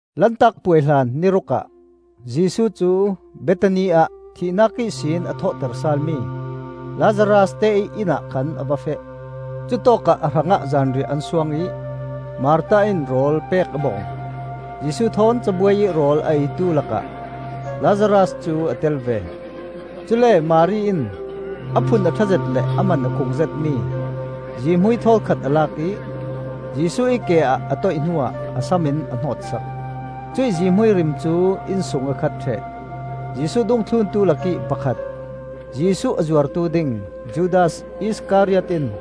Lantak Puai hlan ni ruk ah Jesuh cu Bethani ah thihnak ihsin a thawhter sal mi Lazaras te ih inn ah khan a va feh. Cutawkah a hrangah zanriah an suang ih Martha in rawl pek a bawm. Jesuh thawn cabuai ih rawl a eitu lakah Lazaras cu a tel ve. Cule Mari in a phun a ṭha zet le a man a khung zetmi zihmui thawl khat a lak ih Jesuh ih ke ah a toih hnuah a sam in a hnawtsak. Cuih zihmui rim cu inn sung a khat ṭheh. Jesuh dungthluntu lakih pakhat, Jesuh a zuartu ding Judas Iskariot in,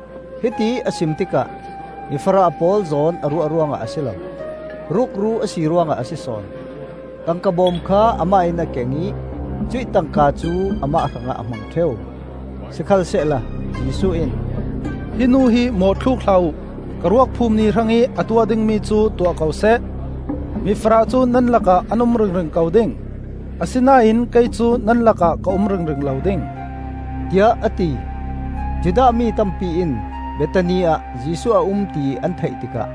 Hitiih a sim tikah mi farah pawl zawn a ruah ruangah a si lo; rukru a si ruangah a si sawn. Tangka bawm kha amah in a keng ih cuih tangka cu amah hrangah a hmang ṭheu. Sikhalsehla Jesuh in, “Hi nu hi mawhthluk hlah uh! Ka ruak phum ni hrangih a tuah dingmi cu tuah ko seh. Mifarah cu nan lakah an um ringring ko ding; asinain kei cu nan lakah ka um ringring lo ding,” tiah a ti. Judah mi tampi in Bethani ah Jesuh a um ti an theih tikah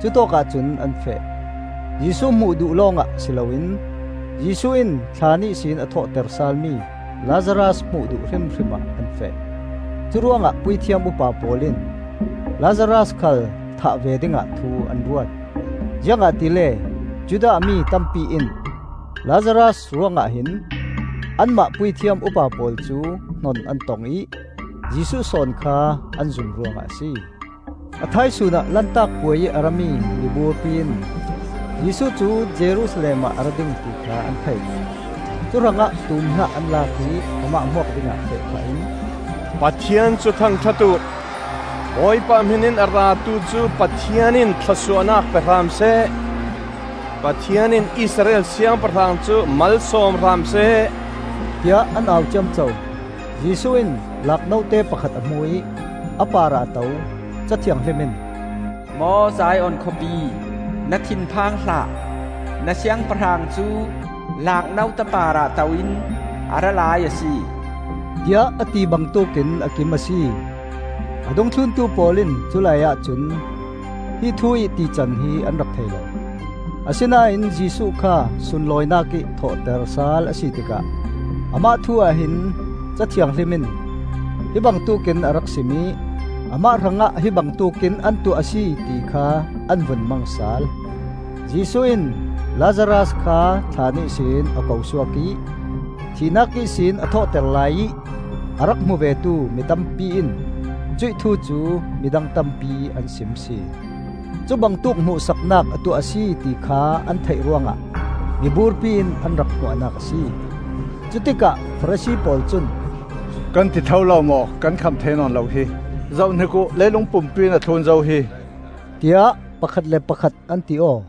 cutawkah cun an feh. Jesuh hmuh duh lawngah si loin Jesuh in thlaan ihsin a thawhter salmi Lazaras hmuh duh hrimhrim ah an feh. Curuangah puithiam upa pawl in Lazaras khal thah ve dingah thu an ruat. Ziangahtile Judah mi tampi in Lazaras ruangah hin anmah puithiam upa pawl cu hnon an tong ih Jesuh sawn kha an zum ruangah a si. A thaisun ah Lantak Puai ih a rami miburpi in Jesuh cu Jerusalem ah a ra ding, ti kha an thei. Cuhrangah tuum hnah an lak ih amah hmuak dingah feh phah in, “Pathian cu thangṭhat uh! Bawipa ih hminin a ratu cu Pathian in thlawsuahnak pe hram seh! Pathian in Israel Siangpahrang cu malsawm hram seh!” tiah an au ciamco. Jesuh in laak note pakhat a hmu ih a parah a to; Ca Thianghlim in: “Maw Zion khawpi, Na thinphang hlah; Na Siangpahrang cu laak note parah to-in a ra lai a si,” tiah a ti bangtuk in a kim a si. A dungthluntu pawl in culaiah cun hi thu ih tican hi an rak thei lo. Asinain Jesuh kha sunlawinak ih thawhter sal a si tikah amah thu-ah hin Ca Thianghlim in hi bangtuk in a rak sim ih amah hrangah hi bangtuk in an tuah a si, ti kha an vun mang sal. Jesuh in Lazaras kha thlaan ihsin a ko suak ih thihnak ihsin a thawhter laiih a rak hmu vetu mi tampi in cuih thu cu midang tampi an sim sin. Cubangtuk hmuhsaknak a tuah a si ti kha an theih ruangah miburpi in an rak hmuahnak a si. Cutikah Farasi pawl cun, “Kan ti tho lo maw; kan kham thei nawn lo hi! Zohhnik uh, leilung pumpi in a thlun zo hi!” tiah pakhat le pakhat an ti aw.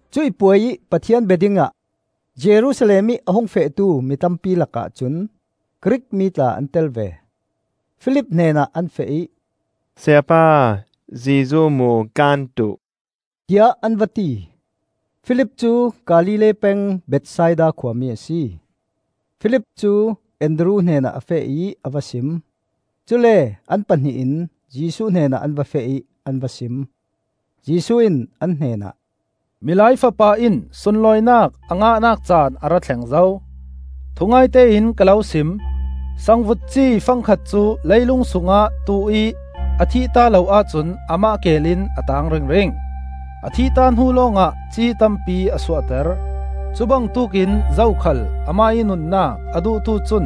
Cuih puai ih Pathian bia dingah Jerusalem ih a hung fehtu mi tampi lakah cun Grik mi tla an tel ve. Filip hnenah an feh ih, “Sayapa, Jesuh hmuh kan duh,” tiah an va ti. Filip cu Galilee peng Bethsaida khuami a si. Filip cu Andru hnenah a feh ih a va sim; cule an pahnih in Jesuh hnenah an va feh ih an va sim. Jesuh in an hnenah, “Milai Fapa in sunlawinak a ngahnak caan a ra thleng zo. Thungaite in ka lo sim: sangvut ci fangkhat cu lei lung sungah tuh ih a thihta lo ahcun amah keel in a taang ringring. A thihta hnu lawngah ci tampi a suahter. Cubangtuk in zokhal amah ih nunnak a duhtu cun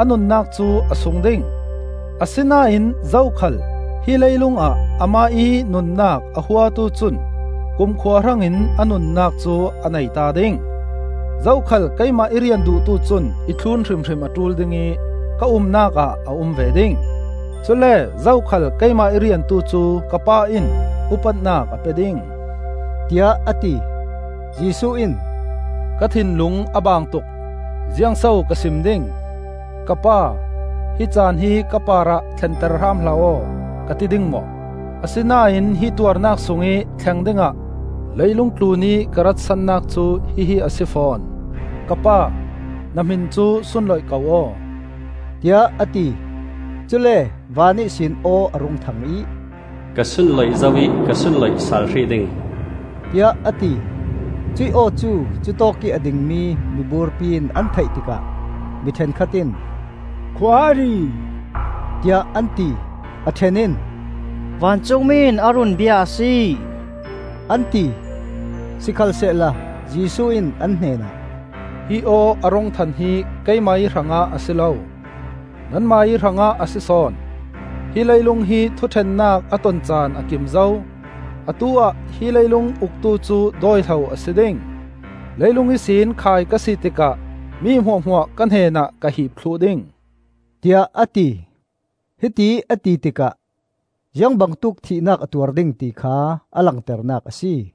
a nunnak cu a sung ding; asinain zokhal hi leilung ah amah ih nunnak a huatu cun kumkhua hrangin a nunnak cu a neita ding. Zokhal keimah i rian duhtu cun i thlun hrimhrim a ṭul ding ih ka umnak ah a um ve ding. Cule zokhal keimah i riantu cu ka Pa in upatnak a pe ding,” tiah a ti. Jesuh in, “Ka thinlung a baang tuk; ziangso ka sim ding? ‘Ka Pa, hi caan hi ka parah thlenter hram hlah aw,’ ka ti ding maw? Asinain hi tuarnak sungih thleng dingah leilung tlunih ka rat sannak cu hihi a si fawn! Ka Pa, na hmin cu sunloih ko aw,” tiah a ti. Cule van ihsin aw a rung thang ih, “Ka sunloih zo ih ka sunloih sal hrih ding,” tiah a ti. Cuih aw cu cutawkih a dingmi miburpi in an theih tikah mi ṭhenkhat in, “Khua a ri,” tiah an ti; a ṭhen in, “Vancungmi in a run bia a si,” an ti. Sikhalsehla Jesuh in an hnenah, “Hi aw a rung than hi keimah ih hrangah a si lo, nanmah ih hrangah a si sawn. Hi leilung hi thuṭhennak a ton caan a kim zo; atu-ah hi leilung uktu cu dawi hlo a si ding. Leilung ihsin khai ka si tikah mi hmuahhmuah ka hnenah ka hiip thluh ding,” tiah a ti. Hitiih a ti tikah ziangbangtuk thihnak a tuar ding ti kha a langternak a si.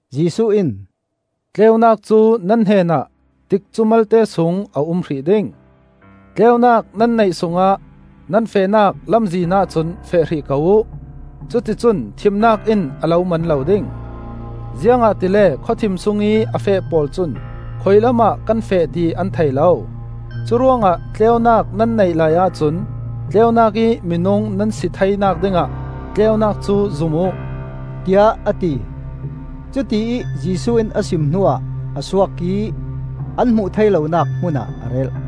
Jesuh in, “Tleunak cu nan hnenah tikcu malte sung a um hrih ding. Tleunak nan neih sungah nan fehnak lamzinah cun feh hrih ko uh; cuti cun thimnak in a lo man lo ding; ziangahtile khawthim sungih a feh pawl cun khuilamah kan feh ti an thei lo. Cuhrangah tleunak nan neih laiah cun, tleunak ih minung nan si theinak dingah, tleunak cu zum uh,” tiah a ti. Cutiih Jesuh in a sim hnuah a suak ih an hmuh thei lonak hmun ah a relh.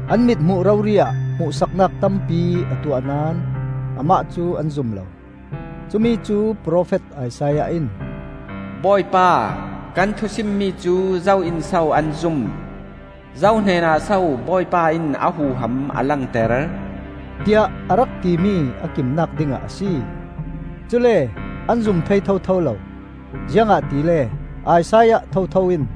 An mithmuh rori ah hmuhsaknak tampi a tuah naón amah cu an zum lo. Cumi cu profet Isaiah in: “Bawipa, kan thu simmi cu zo in so an zum? Zo hnenah so Bawipa in a huham a langter?” tiah a rak timi a kimnak dingah a si. Cule an zum thei thotho lo, ziangahtile Isaiah thotho in: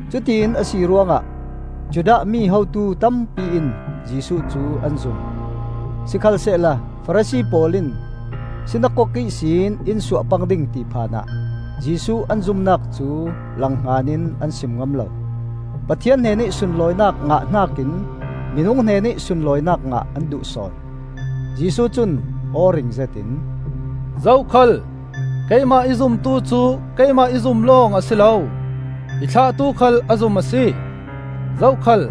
Cutiin a si ruangah Judah mi hotu tampi in Jesuh cu an zum; Sikhalsehla Farasi pawl in sinakok ihsin in suah pang ding ti phan ah Jesuh an zumnak cu langhngan in an sim ngam lo. Pathian hnenih sunlawinak ngah hnakin minung hnenih sunlawinak ngah an duh sawn. Jesuh cun aw ring zetin, “Zokhal keimah i zumtu cu keimah i zum lawng a si lo, i thlahtu khal a zum a si. Zokhal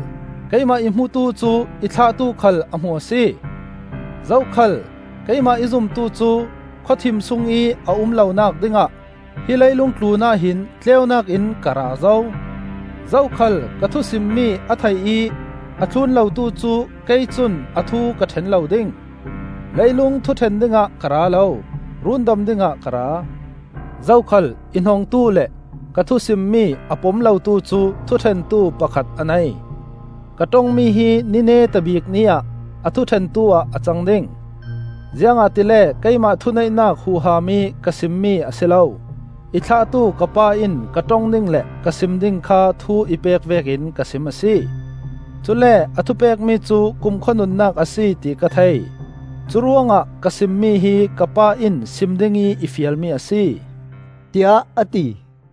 keimah i hmutu cu i thlahtu khal a hmu a si. Zokhal keimah i zumtu cu khawthim sungih a um lonak dingah hi leilung tlunah hin tleunak in ka ra zo. Zokhal ka thu simmi a thei ih a thlun lotu cu kei cun a thu ka ṭhen lo ding. Leilung thuṭhen dingah ka ra lo, rundam dingah ka ra. Zokhal i hnongtu le ka thu simmi a pom lotu cu thuṭhentu pakhat a nei. Ka ṭongmi hi ni neta bik ni ah a thuṭhentu ah a cang ding! Ziangahtile keimah thuneihnak huham ih ka simmi a si lo, i thlahtu ka Pa in ka ṭong ding le ka sim ding kha thu i pek vekin ka sim a si. Cule a thupekmi cu kumkhua nunnak a si ti ka thei. Curuangah ka simmi hi ka Pa in sim dingih i fialmi a si,” tiah a ti.